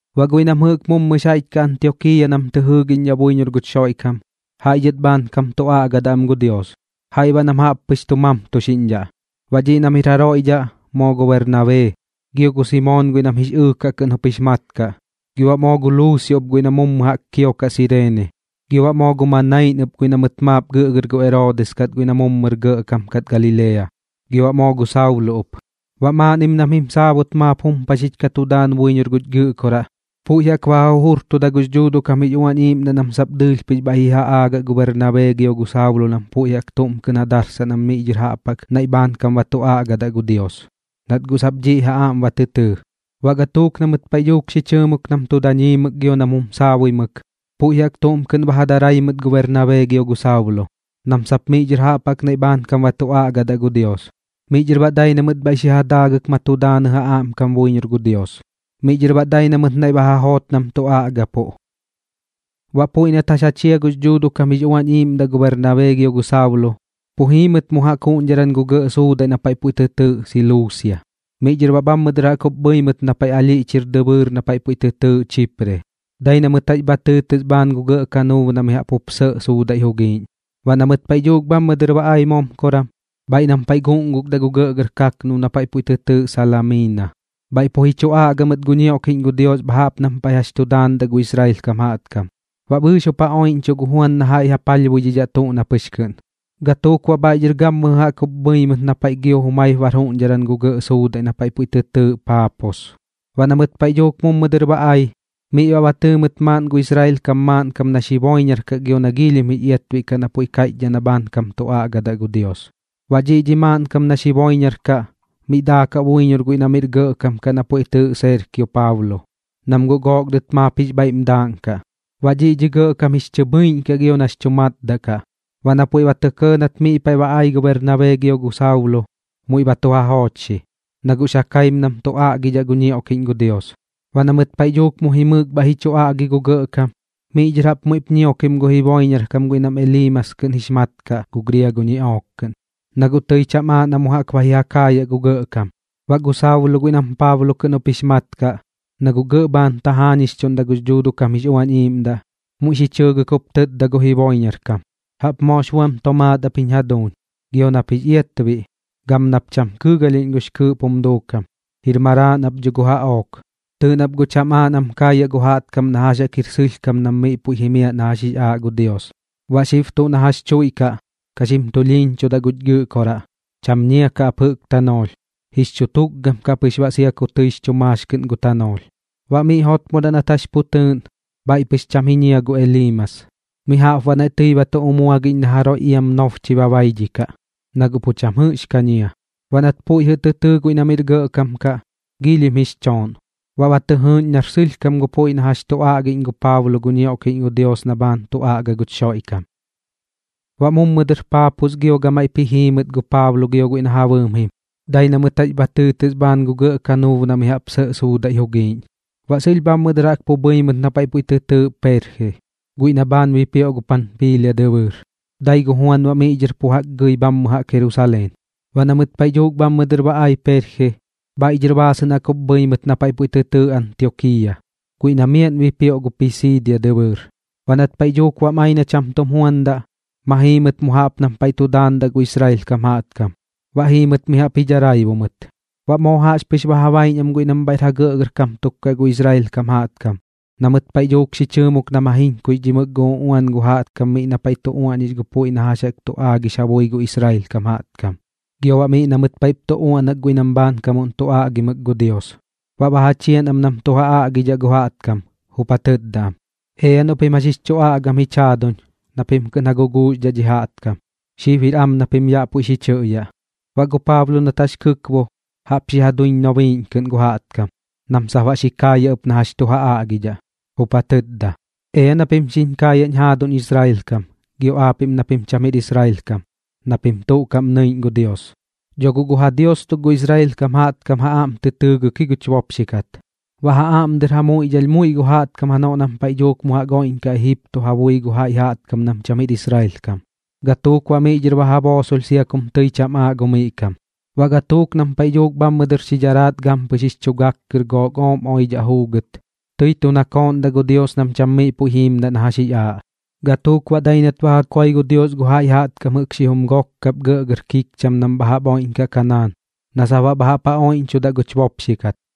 Baꞌ guiꞌ nam jɨꞌk mummɨx jaiꞌch kaꞌ Antiokiiya nam tɨ jɨɨgiꞌñdhaꞌ buiñor guch Xoiꞌkam, jaiꞌ dhɨt bhaankam tu aꞌgadaꞌ am gu Dios, jaiꞌ baꞌ nam jaꞌp pɨx tu mamtuxiꞌñdhaꞌ. Baꞌ dhiꞌ nam jir jaroiꞌ dhaꞌ moo gu Bernabee, gio gu Simoon guiꞌ nam Jix Ɨɨkaꞌ kɨꞌn jup jix mat kaꞌ, gio baꞌ moo gu Luusio ɨp guiꞌ na mummɨ jaꞌk kiokaꞌ Sireene, gio baꞌ moo gu Manain ɨp guiꞌ na mɨt maap gɨꞌgɨr gu Eroodis kat guiꞌ na mummɨr gɇꞌkam kat Galilea, gio baꞌ moo gu Saulo ɨp. Baꞌ maaꞌnnim nam jim saabut maap jumpaxich ka tu daan buiñor guch Gɨꞌkoraꞌ, puiꞌ jaꞌk ba ja jujurtuda gux Dhuuduꞌ kam jix Uañ Iiꞌmdaꞌ nam sap dɨɨlh pɨx bhaiꞌ ba ji ja aagaꞌ gu Bernabee gio gu Saulo nam puiꞌ jaꞌk tuꞌm kɨꞌn ja darsaꞌ nam miꞌ dhɨr jaꞌp jaꞌk naiꞌ bhaankam ba tu aꞌgadaꞌ gu Dios, nat guꞌ sap dhiꞌ ja aꞌm ba tɨ tɨɨ. Baꞌ gatuuk na mɨt paiꞌ dhuuk xi chɨɨmuk nam tu daañimɨk gio nam jum saabuimɨk, puiꞌ jaꞌk tuꞌm kɨꞌn ba ja darai mɨt gu Bernabee gio gu Saulo, nam sap miꞌ dhɨr jaꞌp jaꞌk naiꞌ bhaankam ba tu aꞌgadaꞌ gu Dios. Miꞌ dhɨr baꞌ dai na mɨt bhaiꞌ xi ja daagɨk ma tu daanɨ ja aꞌmkam buiñor gu Dios. Miꞌ dhɨr baꞌ dai na mɨt naiꞌ ba ja joot nam tu aꞌgapuꞌ. Baꞌ puiꞌ nat jax ja chia gux Dhuuduꞌ kam jix Uañ Iiꞌmdaꞌ gu Bernabee gio gu Saulo, pu jii mɨt mu jaꞌk juꞌñdharan gu gɇꞌ suudaiꞌ na paiꞌ puiꞌ tɨ tɨɨꞌ Siluusia. Miꞌ dhɨr baꞌ bhammɨ dɨr jaꞌk jup bhɨi mɨt na paiꞌ alhiꞌch jir dɨbɨɨr na puiꞌ tɨ tɨɨꞌ Chipre, dai na mɨt jax bha tɨɨtɨs bhaan gu gɇꞌ kanuub na mi jaꞌp sɇꞌ suudaiꞌ jugiiꞌñ. Baꞌ na mɨt paiꞌ dhuuk bhammɨ dɨr ba ai momkoran, bhaiꞌ nam paiꞌ guꞌngukdaꞌ gu gɇꞌgɇr kaknub na puiꞌ tɨ tɨɨꞌ Salamiina, bhaiꞌ pu ji chu aꞌga mɨt gu ñioꞌkiꞌñ gu Dios bha jaꞌp nam paiꞌ jax chu daandaꞌ gu Israel kam jaꞌtkam, baꞌ bɨɨx jup ja oiꞌñchuꞌ gu Juan na jaiꞌ ja palhbuidhidhaꞌ tuꞌ na pɨx kɨꞌn. Gatuuk baꞌ bhaiꞌ dhɨr gammɨjɨ dɨr jaꞌk jup bhɨi mɨt na paiꞌ gio jumaip bar juꞌñdharan gu gɇꞌ suudaiꞌ na paiꞌ puiꞌ tɨ tɨɨꞌ Paapos. Baꞌ na mɨt paiꞌ dhuuk mummɨ dɨr ba ai, miꞌ ba tɨɨ mɨt maaꞌn gu Israel kam maaꞌnkam nax jiboiñaraꞌ kaꞌ gio na giilhim jix iatbiꞌ kaꞌ na puiꞌ kaiꞌchdhaꞌ na sap bhaankam tu aꞌgadaꞌ gu Dios. Baꞌ dhiꞌ dhi maaꞌnkam nax jiboiñaraꞌ kaꞌ miꞌ daakaꞌ buiñor guiꞌ na miꞌr gɇꞌkam kaꞌ na puiꞌ tɨɨꞌ Serkio Paulo, nam guꞌ gook dɨt maap jix bhaiꞌm daaꞌnkaꞌ. Baꞌ dhiꞌ dhi gɇꞌkam jix chɨ bhɨiꞌñ kaꞌ gio nax chu matdaꞌ kaꞌ, baꞌ na puiꞌ ba tɇ kɇɇ na mɨt miꞌ paiꞌ ba ai gu Bernabee gio gu Saulo, muiꞌ ba tu ja joochxi, na guꞌx ja kaim nam tu aꞌgidhaꞌ gu ñioꞌkiꞌñ gu Dios. Baꞌ na mɨt paiꞌ dhuuk mu jimɨɨk bhaiꞌ ji chu aꞌgi gu gɇꞌkam, miꞌ dhɨr jaꞌp muiꞌp ñiokim gu jiboiñarkam guiꞌ nam Eliimas kɨꞌn jix mat kaꞌ gu griago ñiꞌook kɨꞌn, na guꞌ tɨi cham aaꞌ na mu jaꞌk ba ji ja kaayaꞌ gu gɇꞌkam. Baꞌ gu Saulo guiꞌ nam Paablo kɨꞌn jup jix mat kaꞌ, na guꞌ gɇꞌ bhaan tajaañixchuꞌ gux Dhuuduꞌ kam jix Uañ Iiꞌmdaꞌ, muiꞌ xi chɨɨgɨk jup tɨtda gu jiboiñarkam: ―¡Jaꞌp moox buam tomaat ap jiñ jaduuñ, gio nap jix iatbiꞌ, gam nap cham kɨɨgalhiꞌñ guꞌx kɨɨꞌp jum duukam! ¡Jir maraaꞌn ap dho gu jaꞌook! Tɨɨꞌ nap guꞌ cham aaꞌ nam kaayaꞌ gu jaꞌtkam na jax jaꞌk jir sɨlhkam nam miꞌ puiꞌ jimiaꞌ na jax jix aaꞌ gu Dios. Baꞌ xib tuꞌ na jax chuiꞌkaꞌ, ka xim tulhiiñchudaꞌ guch Gɨꞌkoraꞌ, cham ñia kaꞌ ap jɨꞌk tanoolh, jix chu tukgam kaꞌ pɨx baꞌ sia ku tɨix chu maax kɨꞌn gu tanoolh. Baꞌ miꞌ jotmodaꞌ nat jax pu tɨɨꞌn, bhaiꞌ pɨx cham ji ñia gu Eliimas, mi jaꞌp baꞌ naiꞌ tɨi ba tu umuagiꞌñ na jaroiꞌ iam nobchɨi ba baidhikaꞌ, na guꞌ pu cham jɨꞌx ka ñia. Baꞌ nat puiꞌ jɨꞌ tɨ tɨɨ guiꞌ na miꞌr gɇꞌkam kaꞌ, giilhim jix chooꞌn, baꞌ ba tɨ jɨɨꞌñ nar sɨlhkam gu puiꞌ na jax tu aꞌgiꞌñ gu Paablo gu ñioꞌkiꞌñ gu Dios na bhaan tu aꞌga guch Xoiꞌkam. Baꞌ mummɨ dɨr Paapos gio gamaiꞌp ji jii mɨt gu Paablo gio guiꞌ na ja bɨɨm jim, dai na mɨt jax bha tɨɨtɨs bhaan gu gɇꞌ kanuub na mi jaꞌp sɇꞌ suudaiꞌ jugiiꞌñ. Baꞌ sɨlh bhammɨ dɨr jaꞌk pu bhɨi mɨt na paiꞌ puiꞌ tɨ tɨɨꞌ Perje, guiꞌ na bhaan bipioꞌ gu Panpiilia dɨbɨɨr. Dai gu Juan baꞌ miꞌ dhɨr pu jaꞌk gɨi bhammɨ jaꞌk Jerusaleen. Baꞌ na mɨt paiꞌ dhuuk bhammɨ dɨr ba ai Perje, bhaiꞌ dhɨr baasɨꞌn jaꞌk jup bhɨi mɨt na paiꞌ puiꞌ tɨ tɨɨꞌ Antiokiiya, guiꞌ na miaꞌn bipioꞌ gu Pisiidia dɨbɨɨr. Baꞌ nat paiꞌ dhuuk bam ai na cham tum juandaꞌ, ma jii mɨt mu jaꞌp nam paiꞌ tu daandaꞌ gu Israel kam jaꞌtkam, baꞌ jiimdat mi jaꞌp ji dharaibu mɨt. Baꞌ moo jaꞌxpɨx ba ja baiꞌñ am guiꞌ nam bhaiꞌr ja gɇꞌkam tuk kaꞌ gu Israel kam jaꞌtkam na mɨt paiꞌ dhuuk xi chɨɨmuk nam ja jiñkuixdhimɨk gu uꞌuan gu jaꞌtkam miꞌ na paiꞌ tu uaꞌñix gu puiꞌ na jax jaꞌk tu aagix ja bui gu Israel kam jaꞌtkam, gio baꞌ miꞌ na mɨt paiꞌp tu uaꞌnak guiꞌ nam bhaankamuꞌn tu aꞌgimɨk gu Dios, baꞌ ba ja chian am nam tu ja aꞌgidhaꞌ gu jaꞌtkam, jup ja tɨtda am: ―Ea noꞌ pim jax jix chu aꞌgam jich jaaduñ na pim kɨꞌn ja guguuxdhaꞌ dhi jaꞌtkam, xib jir am na pim yaꞌ puiꞌ xi chɨꞌyaꞌ. Baꞌ gu Paablo nat jax jup kɨkbo, jaꞌp xi ja duiñ nobiiꞌñ kɨꞌn gu jaꞌtkam nam sap baꞌ xi kaayaꞌ ɨp na jax tu ja aꞌgidhaꞌ, jup ja tɨtda: ―Ea na pim xiñ kaayaꞌñ jaaduñ Israel kam gio aapiꞌm na pim cham jir Israel kam na pim tuꞌ kaꞌm nɨiꞌñ gu Dios. Dho guꞌ gu ja Dios tuk gu Israel kam jaꞌtkam ja aꞌm tɨ tɨɨgɨk ji guch bopxi kat, baꞌ ja aꞌm dɨr ja muiꞌdhalh muiꞌ gu jaꞌtkam janoꞌ nam paiꞌ dhuuk mu jaꞌk oiꞌñkaꞌ Ejipto ja bui gu jaiꞌ jaꞌtkam nam cham jir Israel kam, gatuuk baꞌ miꞌ dhɨr ba ja boosolh sia kum tɨi cham aaꞌ gu miꞌ kam. Baꞌ gatuuk nam paiꞌ dhuuk bhammɨ dɨr xi dharaat gampɨx jix chu gak kɨr gu gook ooꞌm oidhaꞌ juugɨt, tɨi tu nakooꞌndaꞌ gu Dios nam cham miꞌ puiꞌ jiimdaꞌ na jax jix aaꞌ. Gatuuk baꞌ dai nat ba ja koi gu Dios gu jaiꞌ jaꞌtkam jɨꞌk xijum gok kap gɇꞌgɇr kikcham nam bha jaꞌp oiꞌñkaꞌ Kanaan na sap baꞌ bha jaꞌp ja oiꞌñchudaꞌ guch bopxi kat.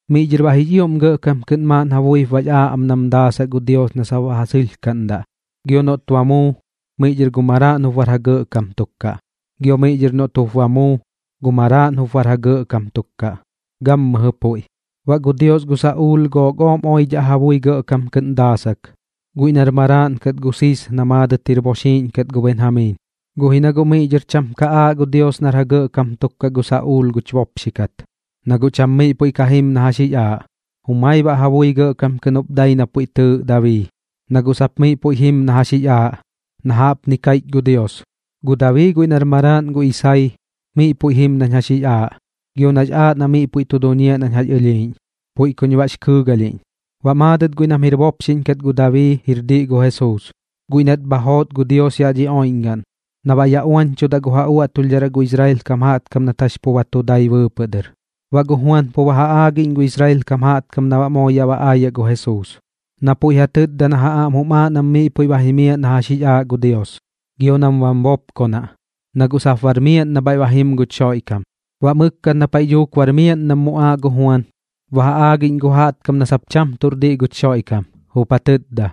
Miꞌ dhɨr baꞌ jix ioꞌm gɇꞌkam kɨꞌn maaꞌn ja buip bax aaꞌ am na daasaꞌ gu Dios na sap baꞌ ja sɨlhkaꞌndaꞌ, gio noꞌt ba muu, miꞌ dhɨr gu maraaꞌn jup bar ja gɇꞌkam tuk kaꞌ, gio miꞌ dhɨr noꞌt jup ba muu, gu maraaꞌn ɨp jup bar ja gɇꞌkam tuk kaꞌ, gammɨjɨ puiꞌ. Baꞌ gu Dios gu Saꞌuul gook ooꞌm oidhaꞌ ja bui gɇꞌkam kɨꞌn daasak, guiꞌ nar maraaꞌn kat gu Sis na maadɨt jir bopxiꞌñ kat gu Benjamiin. Guꞌ ji na guꞌ miꞌ dhɨr cham ka aaꞌ gu Dios nar ja gɇꞌkam tuk kaꞌ gu Saꞌuul guch bopxi kat, na guꞌ cham miꞌ puiꞌ ka jim na jax jix aaꞌ. Jumai baꞌ ja bui gɇꞌkam kɨꞌn jup dai na puiꞌ tɨɨꞌ Dabii, na guꞌ sap miꞌ puiꞌ jim na jax jix aaꞌ, na jaꞌpni kaiꞌch gu Dios: “Gu Dabii guiꞌ nar maraaꞌn gu Isai, miꞌ puiꞌ jim nañ jax jix aaꞌ, gio nax aaꞌ na miꞌ puiꞌ tu duñiaꞌ nañ jax ɨlhiiꞌñ, puiꞌ kuñ baꞌx kɨɨgalhiꞌñ.” Baꞌ maadɨt guiꞌ nam jir bopxiꞌñ kat gu Dabii jir diꞌ gu Jesuus, guiꞌ nat bha joot gu Dios yaꞌ dhi oiꞌñgaꞌn na baꞌ yaꞌ uañchudaꞌ gu ja uaꞌtulhdharaꞌ gu Israel kam jaꞌtkam nat jax pu ba tu dai bɨɨpɨꞌ dɨr. Baꞌ gu Juan pu ba ja aagiꞌñ gu Israel kam jaꞌtkam na baꞌ moo yaꞌ ba aayaꞌ gu Jesuus, na puiꞌ ja tɨtdadaꞌ na ja aꞌm jum aaꞌ nam miꞌ puiꞌ ba jimiaꞌ na jax jix aaꞌ gu Dios, gio nam bam bopkonaꞌ, na guꞌ sap bar miaꞌn na bhaiꞌ ba jim guch Xoiꞌkam. Baꞌ mɨkkat na paiꞌ dhuuk bar miaꞌn nam muꞌaaꞌ gu Juan, ba ja aagiꞌñ gu jaꞌtkam na sap cham tuꞌr diꞌ guch Xoiꞌkam, jup ja tɨtda: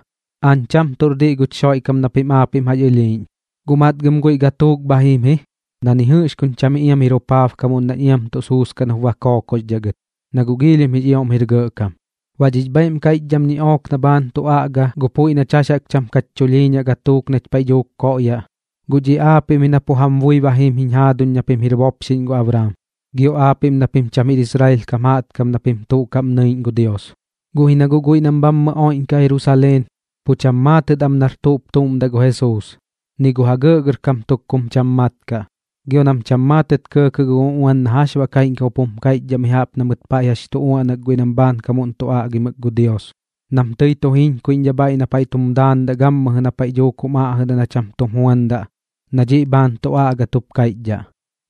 “Aañ cham tuꞌr diꞌ guch Xoiꞌkam na pim aapiꞌm jax ɨlhiiꞌñ, guꞌ matgɨm guiꞌ gatuuk bha jim ji na ni jɨꞌx kuñ cham iam jir jupaabkamuꞌn nañ iam tuꞌ suuskaꞌn jup ba kookoxdhaꞌ gɨt, na guꞌ giilhim jix ioꞌm jir gɇꞌkam.” ’Baꞌ dhix bhaiꞌm kaiꞌchdham ñiꞌook na bhaan tu aꞌga gu puiꞌ nach jax jaꞌk cham kach chulhiiñaꞌ gatuuk nach paiꞌ dhuuk koꞌyaꞌ, guꞌ dhiꞌ aapiꞌm ji na pu jam bui ba jim jiñ jaaduñ na pim jir bopxiꞌñ gu Abraam, gio aapiꞌm na pim cham jir Israel kam na pim tuꞌ kaꞌm nɨiꞌñ gu Dios. Guꞌ ji na guꞌ guiꞌ nam bhammɨ oiꞌñkaꞌ Jerusaleen, pu cham maatɨt am nar tuꞌp tuꞌm daꞌ gu Jesuus, ni gu ja gɇꞌgɇrkam tuk kum cham mat kaꞌ, gio nam cham maatɨt kɇɇkɇꞌ gu uꞌuan na jax baꞌ kaiꞌñkam jup jum kaiꞌchdhaꞌ mi jaꞌp na mɨt paiꞌ jax tu uaꞌnak guiꞌ nam bhaankamuꞌn tu aꞌgimɨk gu Dios nam tɨi tu jiñkuiꞌñdhaꞌ bhaiꞌ na paiꞌ tum daandaꞌ gammɨjɨ na paiꞌ dhuuk jum aꞌjɨdaꞌ na cham tum juandaꞌ na dhiꞌ bhaan tu aꞌgat jup kaiꞌchdhaꞌ.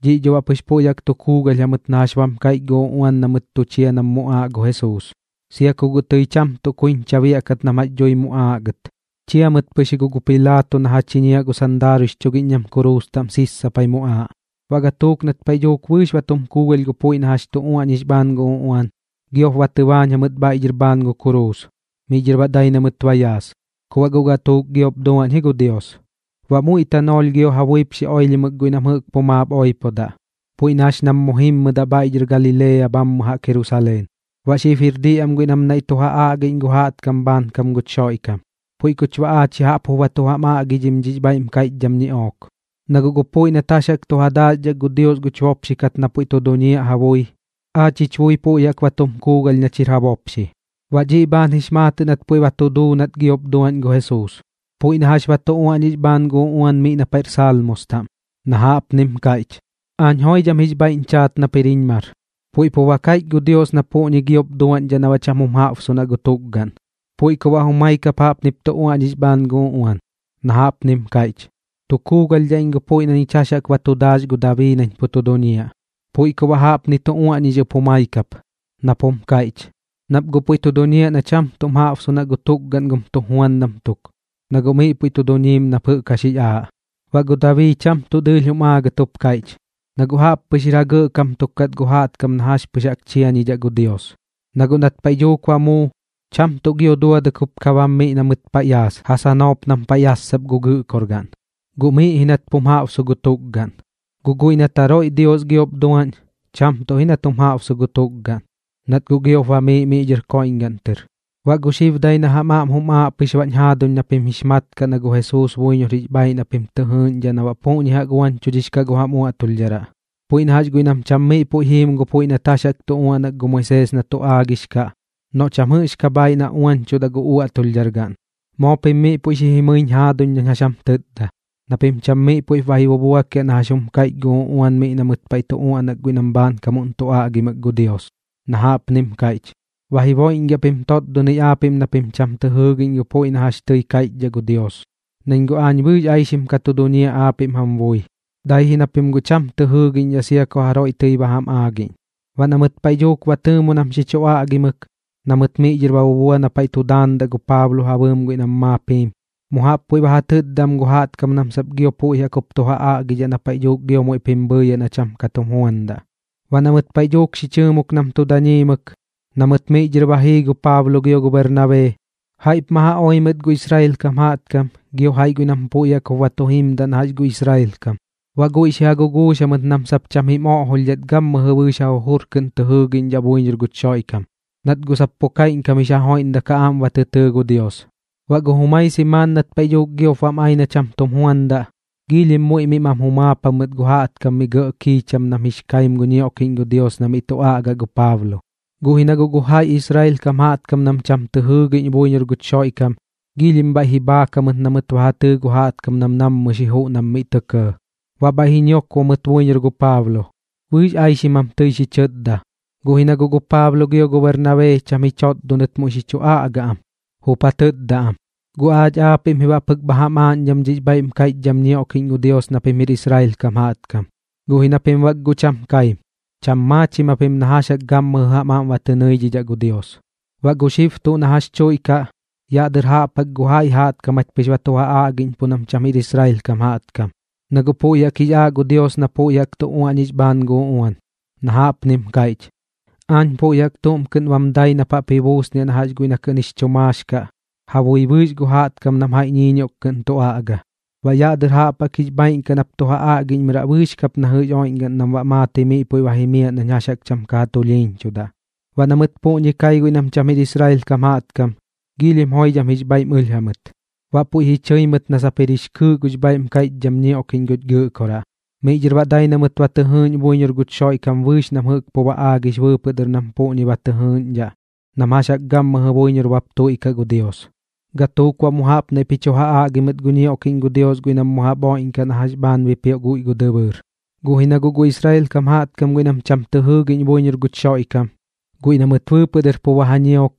Dhiꞌ dho baꞌ pɨx puiꞌ jaꞌk tu kuugalh jamɨt na jax bam kaiꞌch gu uꞌuan na mɨt tu chia nam muꞌaaꞌ gu Jesuus. Sia ku guꞌ tɨi cham tuꞌ kuiñcha biaꞌkat nam jax dhui muꞌaaꞌ gɨt, chia mɨt pɨx ji guꞌ gu Pilaato na ja chiñiaꞌ gu sandaaruiꞌx chugiꞌñ nam kuruus taꞌm sissapai muꞌaaꞌ. Baꞌ gatuuk nat paiꞌ dhuuk bɨɨx ba tum kuugalh gu puiꞌ na jax chu uaꞌñix bhaan gu uꞌuan, giop ba tɨbaañ jamɨt bhaiꞌ dhɨr bhaan gu kuruus, miꞌ dhɨr baꞌ dai na mɨt ba yaas. Ku baꞌ guꞌ gatuuk giop duaꞌñ ji gu Dios. Baꞌ muiꞌ tanoolh gio ja buip xi oilhimɨk guiꞌ nam jɨꞌk pu maap oipodaꞌ, puiꞌ na jax nam mu jimmɨdaꞌ bhaiꞌ dhɨr Galilea bhammɨ jaꞌk Jerusaleen. Baꞌ xib jir diꞌ am guiꞌ nam naiꞌ tu ja aꞌgiꞌñ gu jaꞌtkam bhaankam guch Xoiꞌkam. ’Puiꞌ kuch baꞌ aach ya jaꞌp jup ba tu jam aꞌgidhim dhix bhaiꞌm kaiꞌchdham ñiꞌook. Na guꞌ gu puiꞌ nat jax jaꞌk tu ja daaxdhak gu Dios guch bopxi kat na pu tu duñiaꞌ ja bui, aach jich bui puiꞌ jaꞌk ba tu kuugalh nach jir ja bopxi. Baꞌ dhiꞌ bhaan jix maatɨꞌ nat puiꞌ ba tu duu nat giop duaꞌñ gu Jesuus, puiꞌ na jax ba tu uaꞌñix bhaan gu uꞌuan miꞌ na paiꞌr Salmos taꞌm, na jaꞌpnim kaiꞌch: “Aañ joidham jix bhaiꞌñ chaat nap jir jiñ mar.” Puiꞌ pu ba kaiꞌch gu Dios na puꞌñi giop duaꞌñdhaꞌ na baꞌ cham jum jaꞌbsunaꞌ gu tukgaꞌn, puiꞌ ku baꞌ jumai kap jaꞌpnip tu uaꞌñix bhaan gu uꞌuan, na jaꞌpnim kaiꞌch: “Tu kuugalhdhaꞌ iñ gu puiꞌ na ñich jax jaꞌk ba tu daax gu Dabii nañ pu tu duñiaꞌ.” Puiꞌ ku baꞌ jaꞌpnip tu uaꞌñix ɨp jumai kap, nap jum kaiꞌch: “Nap guꞌ puiꞌ tu duñiaꞌ na cham tuꞌm jaꞌbsunaꞌ gu tukgaꞌn gum tujuandam tuk, na guꞌ miꞌ puiꞌ tu duñiim nap jɨꞌk jax jix aaꞌ.” Baꞌ gu Dabii cham tuꞌ dɨɨlh jum aagat jup kaiꞌch, na guꞌ jaꞌppɨx jir ja gɇꞌkam tuk kat gu jaꞌtkam na jax pɨx jaꞌk chiañidhaꞌ gu Dios. Na guꞌ nat paiꞌ dhuuk ba muu, cham tuꞌ gio duadɨk jup ka bam miꞌ na mɨt paiꞌ yaas ja sanoop nam paiꞌ yassap gu gɨꞌkorgaꞌn, guꞌ miꞌ ji nat pum jaꞌbsu gu tukgaꞌn. Guꞌ guiꞌ nat jaroiꞌ Dios giop duaꞌñ, cham tuꞌ ji nat jum jaꞌbsu gu tukgaꞌn, nat guꞌ giop bamiiꞌ miꞌ dhɨr koiꞌñgaꞌn tɨr. Baꞌ gu xib dai na jam aꞌm bam aaꞌ pɨx baꞌñ jaaduñ na pim jix mat kaꞌ na gu Jesuus buiñor jix bhaiꞌ na pim tɨ jɨɨꞌñdhaꞌ na baꞌ puꞌñi jaꞌk uañchudhix kaꞌ gu jam uaꞌtulhdharaꞌ, puiꞌ na jax guiꞌ nam cham miꞌ puiꞌ jim gu puiꞌ nat jax jaꞌk tu uaꞌnak gu Moisees na tu aagix kaꞌ noꞌ cham jɨꞌx ka bhaiꞌ na uañchudaꞌ gu uaꞌtulhdhar gaꞌn. Moo pim miꞌ puiꞌ xi jimɨiñ jaaduñ nañ jax jam tɨtda na pim cham miꞌ puiꞌp ba ji bubuakiaꞌ na jax jum kaiꞌch gu uꞌuan miꞌ na mɨt paiꞌ tu uaꞌnak guiꞌ nam bhaankamuꞌn tu aꞌgimɨk gu Dios, na jaꞌpnim kaiꞌch: Ba jiboiꞌñgiaꞌ pim totdonɨi aapiꞌm na pim cham tɨ jɨɨgiꞌñ gu puiꞌ na jax tɨi kaiꞌchdhaꞌ gu Dios, nañ guꞌ aañ bɨɨx aixim ka tu duñiaꞌ aapiꞌm jam bui, dai ji na pim guꞌ cham tɨ jɨɨgiꞌñdhaꞌ sia ku jaroiꞌ tɨi ba jam aagiꞌñ. Baꞌ na mɨt paiꞌ dhuuk ba tɨɨmu nam xi chu aꞌgimɨk, na mɨt miꞌ dhɨr ba bubua na paiꞌ tum daandaꞌ gu Paablo ja bɨɨm guiꞌ nam maap jim, mu jaꞌp puiꞌ ba ja tɨtda am gu jaꞌtkam nam sap gio puiꞌ jaꞌk jup tu ja aꞌgidhaꞌ na paiꞌ dhuuk gio muiꞌp jim bhɨɨyaꞌ na cham tum juandaꞌ. Baꞌ na mɨt paiꞌ dhuuk xi chɨɨmuk nam tu daañimɨk, na mɨt miꞌ dhɨr ba jii gu Paablo gio gu Bernabee, jaiꞌp ma ja oi mɨt gu Israel kam jaꞌtkam gio jaiꞌ guiꞌ nam puiꞌ jaꞌk jup ba tu jimdaꞌ na jax gu Israel kam. Baꞌ guiꞌ xi ja guguux jamɨt nam sap cham jim oꞌjolhdhat gammɨjɨ bɨɨx ja jujur kɨꞌn tɨ jɨɨgiꞌñdhaꞌ buiñor guch Xoiꞌkam, nat guꞌ sap pu kaiꞌñkam jix ja joiꞌmdak ja aꞌm ba tɨ tɨɨ gu Dios. Baꞌ gu jumai simaan nat paiꞌ dhuuk giop bam ai na cham tum juandaꞌ, giilhim muiꞌ miꞌ mam jumaap jamɨt gu jaꞌtkam gu miꞌ kam gɇꞌ kiicham nam jix kaim gu ñioꞌkiꞌñ gu Dios na miꞌ tu aꞌga gu Paablo. Guꞌ ji na guꞌ gu jaiꞌ Israel kam jaꞌtkam nam cham tɨ jɨɨgiꞌñ buiñor guch Xoiꞌkam, giilhim bhaiꞌ ji bhaak jamɨt na mɨt ba ja tɨɨ gu jaꞌtkam nam nammɨ xi juꞌ nam miꞌ tɇ kɇɇ. Baꞌ bhaiꞌ ji ñiokbo mɨt buiñor gu Paablo, bɨɨx aixim jam tɨi xi chɨtda. Guꞌ ji na guꞌ gu Paablo gio gu Bernabee cham ji chotdonɨt muiꞌp xi chu aꞌga am, jup ja tɨtda am: ―Guꞌ aach aapiꞌm ji baꞌ pɨk bha jam aaꞌñdham dhix bhaiꞌm kaiꞌchdham ñioꞌkiꞌñ gu Dios na pim jir Israel kam jaꞌtkam, guꞌ ji na pim bak guꞌ cham kaim, cham maachim japim na jax jaꞌk gammɨjɨ jam aꞌm ba tɨ ñɨiꞌñdhaꞌ gu Dios. Baꞌ gu xib tuꞌ na jax chuiꞌkaꞌ, yaꞌ dɨr jaꞌp jaꞌk gu jaiꞌ jaꞌtkam jach pɨx ba tu ja aꞌgiꞌñpuꞌ nam cham jir Israel kam jaꞌtkam, na guꞌ puiꞌ jaꞌk jix aaꞌ gu Dios na puiꞌ jaꞌk tu uaꞌñix bhaan gu uꞌuan, na jaꞌpnim kaiꞌch: Aañ puiꞌ jaꞌk tuꞌm kɨꞌn bam dai nap jaꞌp ji buusniaꞌ na jax guiꞌ na kɨꞌn jix chu maax kaꞌ ja bui bɨɨx gu jaꞌtkam nam jaiꞌ ñiiñioꞌk kɨꞌn tu aꞌga, na baꞌ yaꞌ dɨr jaꞌp jaꞌk jix bhaaiꞌn kaꞌ nap tu ja aꞌgiꞌñmɨraꞌ bɨɨx kap na jɨꞌx jir oiꞌñgaꞌn nam baꞌ maatɨi miꞌ puiꞌ ba jimiaꞌ nañ jax jaꞌk cham ka ja tulhiiñchudaꞌ. Baꞌ na mɨt puꞌñi kai guiꞌ nam cham jir Israel kam jaꞌtkam, joidham jix bhaiꞌm ɨlh jamɨt, baꞌ puiꞌ ji chɨi mɨt na sap jir jix kɨɨꞌ gux bhaiꞌm kaiꞌchdham ñioꞌkiꞌñ guch Gɨꞌkoraꞌ. Miꞌ dhɨr baꞌ dai na mɨt ba tɨ jɨɨꞌñ buiñor guch Xoiꞌkam bɨɨx nam jɨꞌk pu ba aagix bɨɨpɨꞌ dɨr nam puꞌñi ba tɨ jɨɨꞌñdhaꞌ nam jax jaꞌk gammɨjɨ buiñor bap tuiꞌkaꞌ gu Dios. Gatuuk baꞌ mu jaꞌp naiꞌp ji chu ja aꞌgi mɨt gu ñioꞌkiꞌñ gu Dios guiꞌ nam mu jaꞌp oiꞌñkaꞌ na jɨꞌx bhaan bipioꞌ guiꞌ gu dɨbɨɨr. Guꞌ ji na guꞌ gu Israel kam jaꞌtkam guiꞌ nam cham tɨ jɨɨgiꞌñ buiñor guch Xoiꞌkam, guiꞌ na mɨt bɨɨpɨꞌ dɨr pu ba ja ñiok,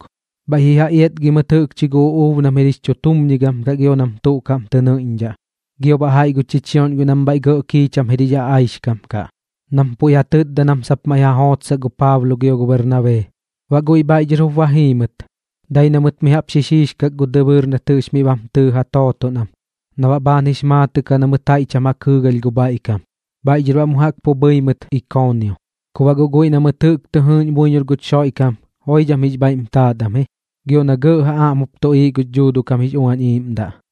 bhaiꞌ ji ja iatgi mɨt jɨꞌkchi gu uꞌuub nam jir jix chutumñigam kaꞌ gio nam tuꞌ kaꞌm tɨ nɨiꞌñdhaꞌ, gio baꞌ jaiꞌ gu chichioꞌñ guiꞌ nam bhaiꞌ gɇꞌ kiicham jir jix aꞌaixkam kaꞌ, nam puiꞌ ja tɨtda nam sap maiꞌ ja jootsaꞌ gu Paablo gio gu Bernabee. Baꞌ guiꞌ bhaiꞌ dhɨr jup ba jii mɨt, dai na mɨt mi jaꞌp xixiixkak gu dɨbɨɨr nat jɨꞌx miꞌ bam tɨɨ ja tooton am na baꞌ bhaan jix maatɨꞌ kaꞌ na mɨt jaiꞌ cham ja kɨɨgalh gu bhaiꞌ kam. Bhaiꞌ dhɨr baꞌ mu jaꞌk pu bhɨi mɨt Ikoonio. Ku guꞌ guiꞌ na mɨt jɨꞌk tɨ jɨɨꞌñ buiñor guch Xoiꞌkam joidham jix bhaiꞌm taat am ji, gio na gɇꞌ ja aꞌm jup tuꞌiiꞌ gux Dhuuduꞌ kam jix Uañ Iiꞌmdaꞌ.